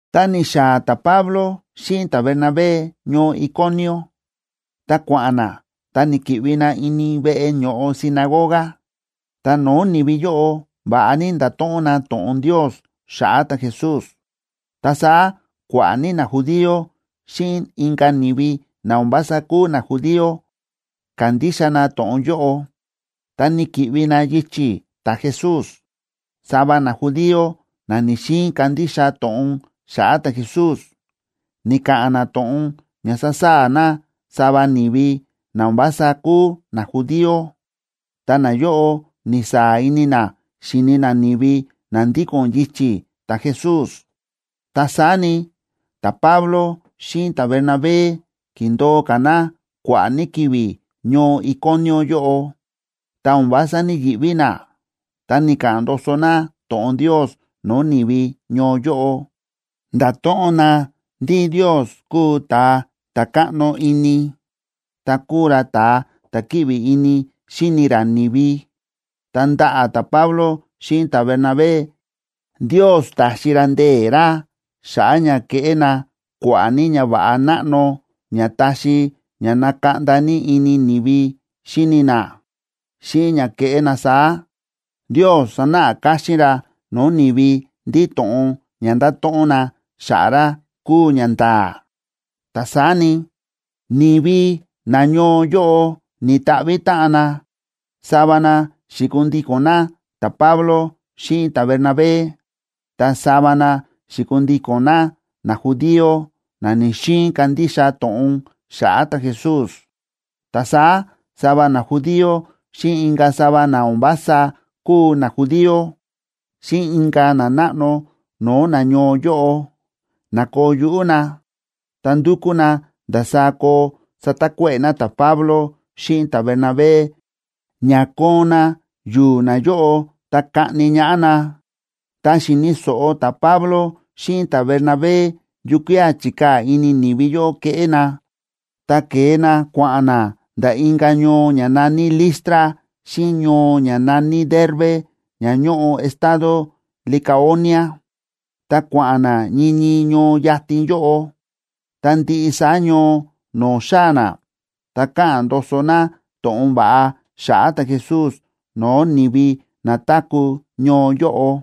Tá ni̱xaa̱ ta̱Pablo xíꞌin ta̱Bernabé ñoo Iconio, ta kua̱ꞌa̱n na ta ni̱ki̱ꞌvi na ini veꞌe ño̱ꞌo sinagoga, ta no̱o̱ ni̱vi yóꞌo va̱ꞌa ní nda̱to̱ꞌon na to̱ꞌon Ndios xa̱ꞌa̱ ta̱Jesús. Ta saá kua̱ꞌa̱ ní najudío xíꞌin inka̱ ni̱vi na o̱n vása kúu najudío ka̱ndixa na to̱ꞌon yóꞌo, ta ni̱ki̱ꞌvi na yichi̱ ta̱Jesús. Sava najudío na ni̱‑xiin kandixa to̱ꞌon xa̱ꞌa̱ ta̱Jesús, ni̱ka̱ꞌa̱n na to̱ꞌon ña sa̱saa̱ na sava ni̱vi na o̱n vása kúu najudío, ta nayóꞌo ni̱saa̱ ini na xíni na ni̱vi na ndíko̱n yichi̱ ta̱Jesús. Ta saá ni, ta̱Pablo xíꞌin ta̱Bernabé ki̱ndo̱o ka̱ na kua̱ꞌa̱ ní ki̱vi̱ ñoo Iconio yóꞌo, ta o̱n vása ní‑yiꞌví na, ta ni̱ka̱ꞌa̱n ndoso na to̱ꞌon Ndios no̱o̱ ni̱vi ñoo yóꞌo, ndáto̱ꞌon na ndí Ndios kúu ta̱a ta̱ káꞌno ini, ta kúu ra ta̱ kíꞌvi ini xíni ra ni̱vi. Ta ndaꞌa̱ ta̱Pablo xíꞌin ta̱Bernabé, Ndios ta̱xi ra ndee̱ ra xa̱ꞌa̱ ña ke̱ꞌé na kua̱ꞌa̱ ní ñava̱ꞌa náꞌno ña ta̱xi ña na̱kaꞌnda ní ini ni̱vi xíni na. Xíꞌin ña kéꞌé na saá, Ndios sa̱náꞌa káxín ra no̱o̱ ni̱vi ndí to̱ꞌon ña nda̱to̱ꞌon na xa̱ꞌa̱ ra kúu ñanda̱a̱. Ta saá ni, ni̱vi nañoo yóꞌo ni̱ta̱ꞌvi̱ táꞌan na: sava na xi̱kundíko̱n na ta̱Pablo xíꞌin ta̱Bernabé, ta sava na xi̱kundíko̱n na najudío na ni̱‑xiin kandixa to̱ꞌon xa̱ꞌa̱ ta̱Jesús. Ta saá sava najudío, xíꞌin inka̱ sava na o̱n vása kúu najudío, xíꞌin inka̱ nanáꞌno no̱o̱ nañoo yóꞌo, na̱koo yuꞌú na, ta ndu̱kú na ndasaá koo satakuéꞌe̱ na ta̱Pablo xíꞌin ta̱Bernabé ña koon na yu̱u̱ nayóꞌo ta kaꞌni ñaꞌá na. Tá xi̱ni̱ so̱ꞌo ta̱Pablo xíꞌin ta̱Bernabé yukía̱ chi̱kaa̱ ini ni̱vi yóꞌo keꞌé na, ta ke̱e na kua̱ꞌa̱n na nda̱ inka̱ ñoo ña na̱ní Listra xíꞌin ñoo ña na̱ní Derbe ña ñóꞌo estado Licaonia, ta kua̱ꞌa̱n na ñii ñii ñoo yatin yóꞌo. Ta ndiꞌi saá ñoo no̱o̱ xáa̱ na, ta káꞌa̱n ndoso na to̱ꞌon va̱ꞌa xa̱ꞌa̱ ta̱Jesús no̱o̱ ni̱vi na táku̱ ñoo yóꞌo.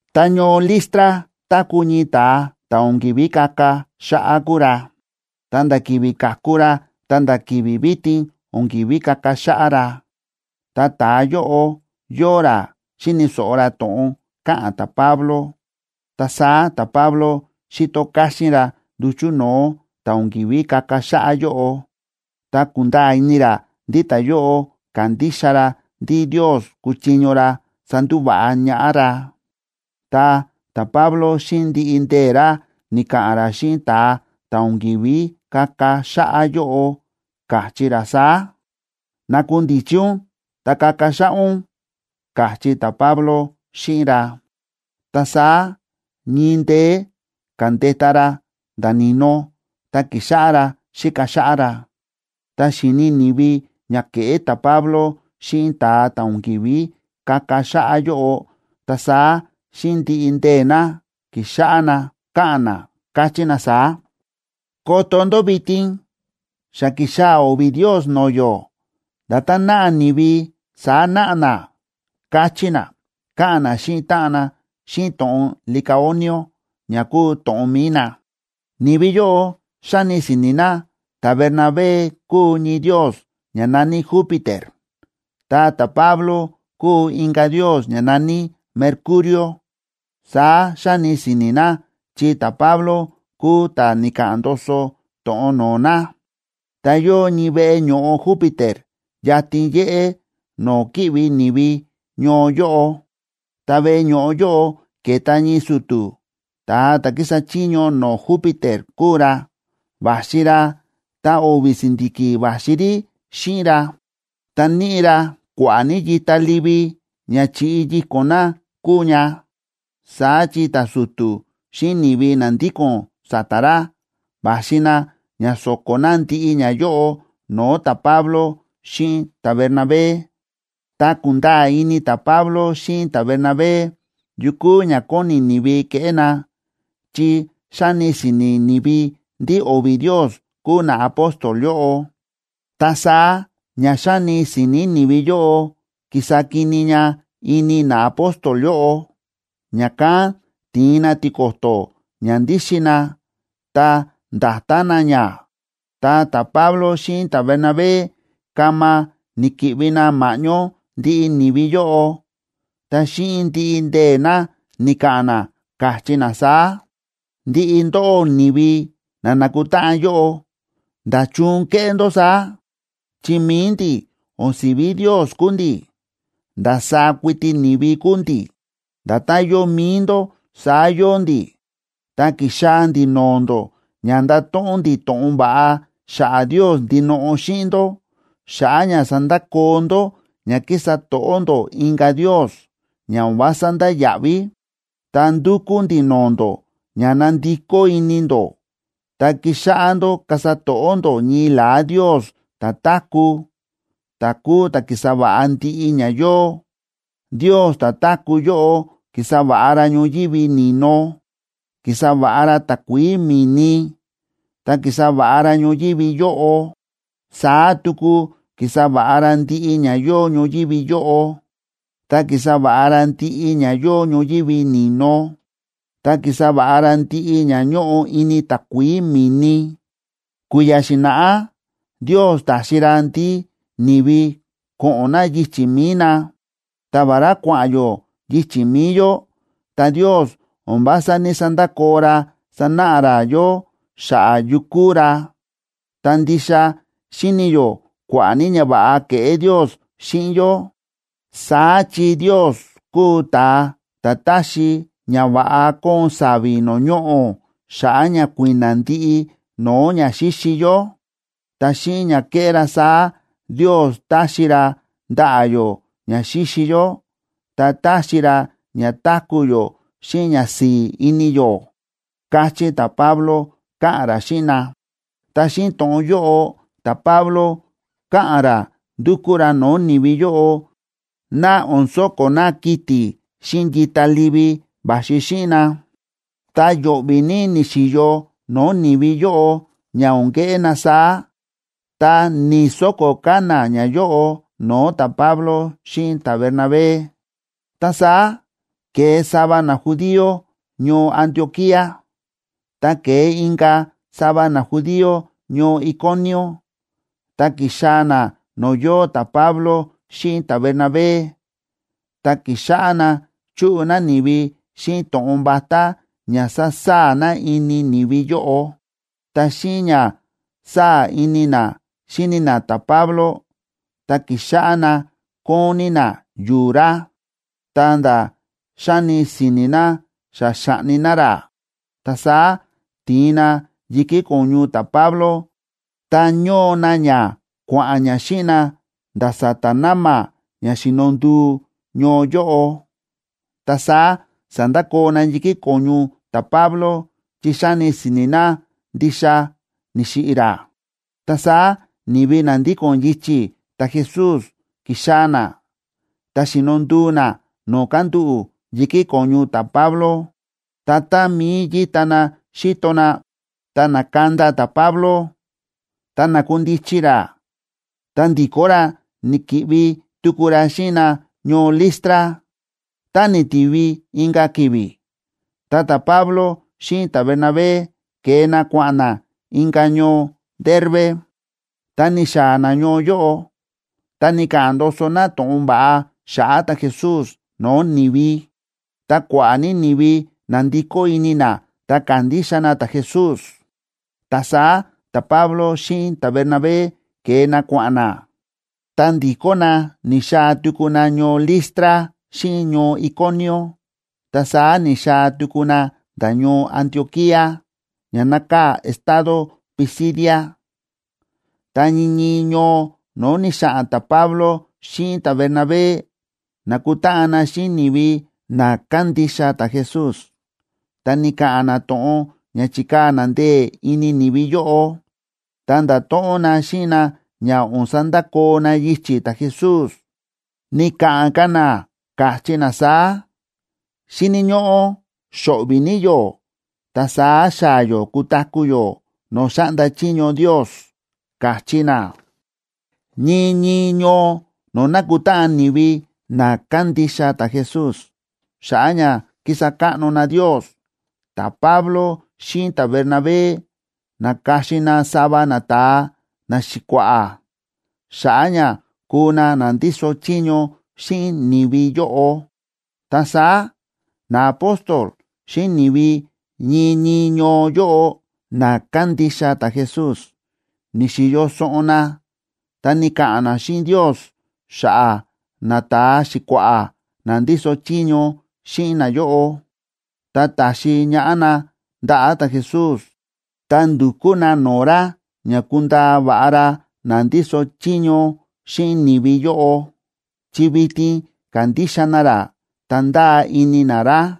Ta ñoo Listra táku̱ ñii ta̱a, ta̱ o̱n ki̱ví kaka xáꞌá kúu ra, ta nda̱ ki̱vi̱ ka̱ku ra ta̱nda̱ vitin o̱n ki̱ví kaka xáꞌá ra. Ta ta̱a yóꞌo yóo ra xíni̱ so̱ꞌo ra to̱ꞌon káꞌa̱n ta̱Pablo, ta saá ta̱Pablo xi̱to káxín ra nduchu̱ no̱o̱ ta̱ o̱n ki̱ví kaka xáꞌá yóꞌo, ta ku̱nda̱a̱ ini ra ndí ta̱yóꞌo kándixa ra ndí Ndios kúchiño ra sandúva̱ꞌa ñaꞌá ra. Ta ta̱Pablo, xíꞌin ndiꞌi ndee̱ ra, ni̱ka̱ꞌa̱n ra xíꞌin ta̱a ta̱ o̱n ki̱ví kaka xáꞌá yóꞌo, káchí ra saá: ―Nakundichi ún ta kaka xáꞌá ún ―káchí ta̱Pablo xíꞌin ra. Ta saá ñii ndeé ka̱ndeta ra nda̱ ni̱no, ta ki̱xáꞌá ra xíka xáꞌá ra. Tá xi̱ni ni̱vi ña ke̱ꞌé ta̱Pablo xíꞌin ta̱a ta̱ o̱n ki̱ví kaka xáꞌá yóꞌo, ta saá xíꞌin ndiꞌi ndee̱ na, ki̱xáꞌá na káꞌa̱n na, káchí na saá: ―¡Koto ndó vitin! Xa ki̱xaa̱ o̱vi̱ ndios no̱o̱ yó. Nda̱tán náꞌa ni̱vi saá náꞌa na ―káchí na, káꞌa̱n na xíꞌin táꞌan na xíꞌin to̱ꞌon licaonio, ña kúu to̱ꞌon mi̱i na. Ni̱vi yóꞌo xáni si̱ni̱ na ta̱Bernabé kúu ñii ndios ña na̱ní Júpiter, ta ta̱Pablo kúu inka̱ ndios ña na̱ní Mercurio. Saá xáni si̱ni̱ na chi ta̱Pablo kúu ta̱ ni̱ka̱ꞌa̱n ndoso to̱ꞌon no̱o̱ na. Ta yóo ñii veꞌe ño̱ꞌo Júpiter yatin yéꞌé no̱o̱ kíꞌvi ni̱vi ñoo yóꞌo. Ta veꞌe ño̱ꞌo yóꞌo ke̱ta ñii su̱tu̱, ta̱a ta̱ kísa chiño no̱o̱ Júpiter kúu ra. Va̱xi ra, ta o̱vi̱ si̱ndi̱ki̱ va̱xi rí xíꞌin ra, ta níꞌi ra kua̱ꞌa̱ ní yita livi ña chi̱ꞌi yíko̱n na kúu ña. Saá chi ta̱su̱tu̱ xíꞌin ni̱vi na ndíko̱n sa̱ta̱ ra, va̱xi na ña so̱ko̱ na ndiꞌi ñayóꞌo no̱o̱ ta̱Pablo xíꞌin ta̱Bernabé. Ta ku̱nda̱a̱ ini ta̱Pablo xíꞌin ta̱Bernabé yu kúu ña kóni ni̱vi keꞌé na, chi xáni si̱ni̱ ni̱vi ndí o̱vi̱ ndios kúu naapóstol yóꞌo, ta saá ña xáni si̱ni̱ ni̱vi yóꞌo ki̱sa kini ña ini naapóstol yóꞌo, ña̱kán ti̱in na tiko̱to̱ ña ndíxin na, ta nda̱ta na ña. Ta ta̱Pablo xíꞌin ta̱Bernabé kama ni̱ki̱ꞌvi na ma̱ꞌñó ndiꞌi ni̱vi yóꞌo, ta xíꞌin ndiꞌi ndee̱ na ni̱ka̱ꞌa̱n na, káchí na saá: ―Ndiꞌi ndóꞌó ni̱vi na nákutáꞌan yóꞌo, ¿nda̱chun kéꞌé ndó saá? Chi mi̱i ndi̱, o̱n si̱ví ndios kúu ndi̱, ndasaá kuiti ni̱vi kúu ndi̱. Nda̱tán yóo mi̱i ndó, saá yóo ndi̱, ta ki̱xaa̱ ndi̱ no̱o̱ ndó ña ndato̱ꞌon ndi̱ to̱ꞌon va̱ꞌa xa̱ꞌa̱ Ndios ndinoꞌo xíꞌin ndó, xa̱ꞌa̱ ña sandakoo ndó ña kísa to̱ꞌó ndó inka̱ ndios, ña o̱n vása ndáya̱ꞌví. Ta ndúkú ndi̱ no̱o̱ ndó ña nandikó ini ndó ta kixáꞌá ndó kasa to̱ꞌó ndó ñii la̱á Ndios ta̱táku̱, ta̱ kúu ta̱ ki̱sa va̱ꞌa ndiꞌi ña yóo. Ndios ta̱táku̱ yóꞌo ki̱sa va̱ꞌa ra ñoyívi ni̱no, ki̱sa va̱ꞌa ra takuií mi̱ni, ta ki̱sa va̱ꞌa ra ñoyívi yóꞌo. Saá tuku ki̱sa va̱ꞌa ra ndiꞌi ña yóo ñoyívi yóꞌo, ta ki̱sa va̱ꞌa ra ndiꞌi ña yóo ñoyívi ni̱no, ta ki̱sa va̱ꞌa ra ndiꞌi ña ñóꞌo ini takuií mi̱ni. Kui̱ya̱ xi̱na̱ꞌá Ndios ta̱xi ra ndí ni̱vi ko̱ꞌo̱n na yichi̱ mi̱i na. Ta vará kua̱ꞌa̱n yó yichi̱ mi̱i yó, ta Ndios o̱n vása ní‑sandakoo ra sánáꞌa ra yó xa̱ꞌa̱ yu kúu ra, ta ndixa xíni yó kua̱ꞌa̱ ní ñava̱ꞌa kéꞌé Ndios xíꞌin yó. Saá chi Ndios kúu ta̱a ta̱ táxi ña va̱ꞌa kóon sa̱vi̱ no̱o̱ ñoꞌo̱ xa̱ꞌa̱ ña kui̱na̱ ndiꞌi no̱o̱ ña xíxi yó. Ta xíꞌin ña ke̱ꞌé ra saá, Ndios táxi ra ndaꞌa̱ yó ña xíxi yó, ta táxi ra ña táku̱ yó xíꞌin ñasi̱i̱ ini yó ―káchí ta̱Pablo, káꞌa̱n ra xíꞌin na. Ta xíꞌin to̱ꞌon yóꞌo ta̱Pablo káꞌa̱n ra ndúkú ra no̱o̱ ni̱vi yóꞌo ná o̱n so̱ko̱ na kiti̱ xíꞌin yita livi va̱xi xíꞌin na. Ta yo̱ꞌvi̱ ní ni̱xi̱yo no̱o̱ ni̱vi yóꞌo ña o̱n keꞌé na saá, ta ni̱‑soko̱ ka̱ na ñayóꞌo no̱o̱ ta̱Pablo xíꞌin ta̱Bernabé. Ta saá ke̱e sava najudío ñoo Antioquía, ta ke̱e inka̱ sava najudío ñoo Iconio, ta ki̱xaa̱ na no̱o̱ yóo ta̱Pablo xíꞌin ta̱Bernabé, ta ki̱xáꞌá na chúꞌu na ni̱vi xíꞌin to̱ꞌon vatá ña sasaa̱ na ini ni̱vi yóꞌo. Ta xíꞌin ña sáa̱ ini na xíni na ta̱Pablo, ta ki̱xáꞌá na kóon ní na yu̱u̱ ra, ta̱nda̱ xáni si̱ni̱ na xa xa̱ꞌni na ra. Ta saá ti̱in na yi̱kí ko̱ñu ta̱Pablo, ta ño̱o na ña kua̱ꞌa̱n ña xíꞌin na nda̱ sa̱ta̱ na̱ma̱ ña xíno nduu ñoo yóꞌo. Ta saá sa̱ndakoo na yi̱kí ko̱ñu ta̱Pablo chi xáni si̱ni̱ na ndixa ni̱xiꞌi̱ ra. Ta saá ni̱vi na ndíko̱n yichi̱ ta̱Jesús ki̱xaa̱ na, ta xi̱no nduu na no̱o̱ kándúꞌu̱ yi̱kí ko̱ñu ta̱Pablo. Ta tá mií yíta na xíto na, ta na̱kanda ta̱Pablo, ta na̱kundichi ra, ta ndi̱kó ra ni̱ki̱ꞌvi tuku ra xíꞌin na ñoo Listra. Tá ni̱tivi inka̱ ki̱vi̱, ta ta̱Pablo xíꞌin ta̱Bernabé ke̱e na kua̱ꞌa̱n na inka̱ ñoo Derbe. Tá ni̱xaa̱ na ñoo yóꞌo, ta ni̱ka̱ꞌa̱n ndoso na to̱ꞌon va̱ꞌa xa̱ꞌa̱ ta̱Jesús no̱o̱ ni̱vi, ta kua̱ꞌa̱ ní ni̱vi na̱ndikó ini na ta ka̱ndixa na ta̱Jesús. Ta saá ta̱Pablo xíꞌin ta̱Bernabé ke̱e na kua̱ꞌa̱n na, ta ndi̱kó na ni̱xaa̱ tuku na ñoo Listra xíꞌin ñoo Iconio, ta saá ni̱xaa̱ tuku na nda̱ ñoo Antioquía, ña nákaa̱ estado Pisidia. Ta ñii ñii ñoo no̱o̱ ni̱xa̱ꞌa̱n ta̱Pablo xíꞌin ta̱Bernabé, na̱kutáꞌan na xíꞌin ni̱vi na kándixa ta̱Jesús, ta ni̱ka̱ꞌa̱n na to̱ꞌon ña chi̱kaa̱ na ndee̱ ini ni̱vi yóꞌo, ta nda̱to̱ꞌon na xíꞌin na ña o̱n sandakoo na yichi̱ ta̱Jesús. Ni̱ka̱ꞌa̱n ka̱ na, káchí na saá: ―Xíni̱ ñóꞌó xo̱ꞌvi̱ ní yó ta saá xaa̱ yó kutaku̱ yó no̱o̱ xáꞌnda chiño Ndios ―káchí na. Ñii ñii ñoo no̱o̱ nákutáꞌan ni̱vi na kándixa ta̱Jesús xa̱ꞌa̱ ña kísa káꞌno na Ndios, ta̱Pablo xíꞌin ta̱Bernabé na̱ka̱xin na sava nata̱a naxi̱kua̱ꞌa̱ xa̱ꞌa̱ ña kuu na na ndíso chiño xíꞌin ni̱vi yóꞌo. Ta saá naapóstol xíꞌin ni̱vi ñii ñii ñoo yóꞌo na kándixa ta̱Jesús, ni̱xi̱yo soꞌon na ta ni̱ka̱ꞌa̱n na xíꞌin Ndios xa̱ꞌa̱ nata̱a xi̱kua̱ꞌa̱ na ndíso chiño xíꞌin nayóꞌo, ta ta̱xi ñaꞌá na ndaꞌa̱ ta̱Jesús, ta ndu̱kú na no̱o̱ ra ña kundaa va̱ꞌa ra na ndíso chiño xíꞌin ni̱vi yóꞌo, chi vitin kándixa na ra, ta ndáa ini na ra.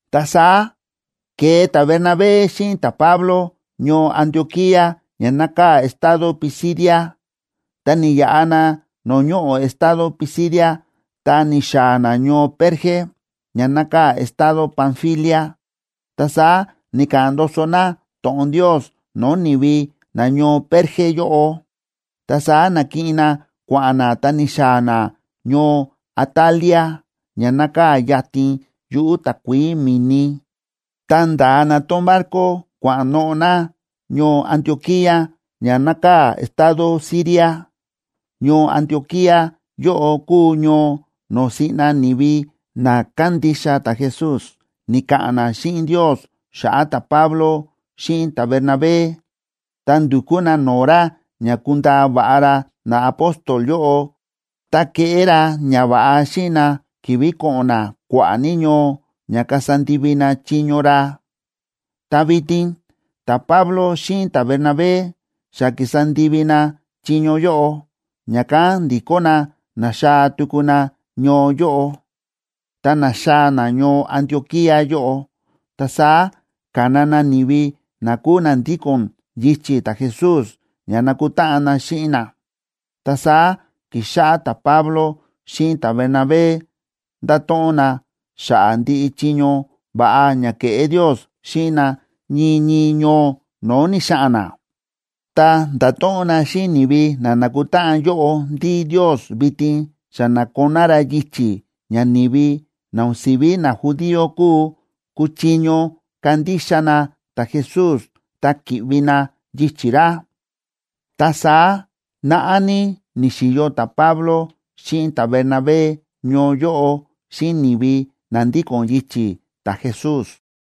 Ta saá ke̱e ta̱Bernabé xíꞌin ta̱Pablo ñoo Antioquía ña nákaa̱ estado Pisidia, ta ni̱yaꞌa na no̱o̱ ñoꞌo̱ estado Pisidia, ta ni̱xaa̱ na ñoo Perge, ña nákaa̱ estado Panfilia. Ta saá ni̱ka̱ꞌa̱n ndoso na to̱ꞌon Ndios no̱o̱ ni̱vi nañoo Perge yóꞌo. Ta saá na̱kiꞌin na kua̱ꞌa̱n na ta ni̱xaa̱ na ñoo Atalia, ña nákaa̱ yatin yuꞌu̱ takuií mi̱ni, ta nda̱a na tón barco kua̱ꞌa̱n noꞌo̱ na ñoo Antioquía ña nákaa̱ estado Siria. Ñoo Antioquía yóꞌo kúu ñoo no̱o̱ siꞌna ni̱vi na kándixa ta̱Jesús ni̱ka̱ꞌa̱n na xíꞌin Ndios xa̱ꞌa̱ ta̱Pablo xíꞌin ta̱Bernabé, ta ndu̱kú na no̱o̱ ra ña kundaa va̱ꞌa ra naapóstol yóꞌo ta keꞌé ra ñava̱ꞌa xíꞌin na ki̱vi̱ ko̱ꞌo̱n na kua̱ꞌa̱ ní ñoo ña kasa ndivi na chiño ra. Ta vitin ta̱Pablo xíꞌin ta̱Bernabé xa ki̱sa ndivi na chiño yóꞌo, ña̱kán ndi̱kó na na̱xaa̱ tuku na ñoo yóꞌo. Tá na̱xaa̱ na ñoo Antioquía yóꞌo, ta saá ka̱na na ni̱vi na kúu na ndíko̱n yichi̱ ta̱Jesús ña nakutáꞌan na xíꞌin na. Ta saá ki̱xáꞌá ta̱Pablo xíꞌin ta̱Bernabé nda̱to̱ꞌon na xa̱ꞌa̱ ndiꞌi chiño va̱ꞌa ña ke̱ꞌé Ndios xíꞌin na ñii ñii ñoo no̱o̱ ni̱xa̱ꞌa̱n na. Ta nda̱to̱ꞌon na xíꞌin ni̱vi na na̱kutáꞌan yóꞌo ndí Ndios vitin xa na̱koná ra yichi̱ ña ni̱vi na o̱n si̱ví najudío kúu, kúchiño kandixa na ta̱Jesús, ta ki̱ꞌvi na yichi̱ ra. Ta saá naꞌá ní ni̱xi̱yo ta̱Pablo xíꞌin ta̱Bernabé ñoo yóꞌo, xíꞌin ni̱vi na ndíko̱n yichi̱ ta̱Jesús.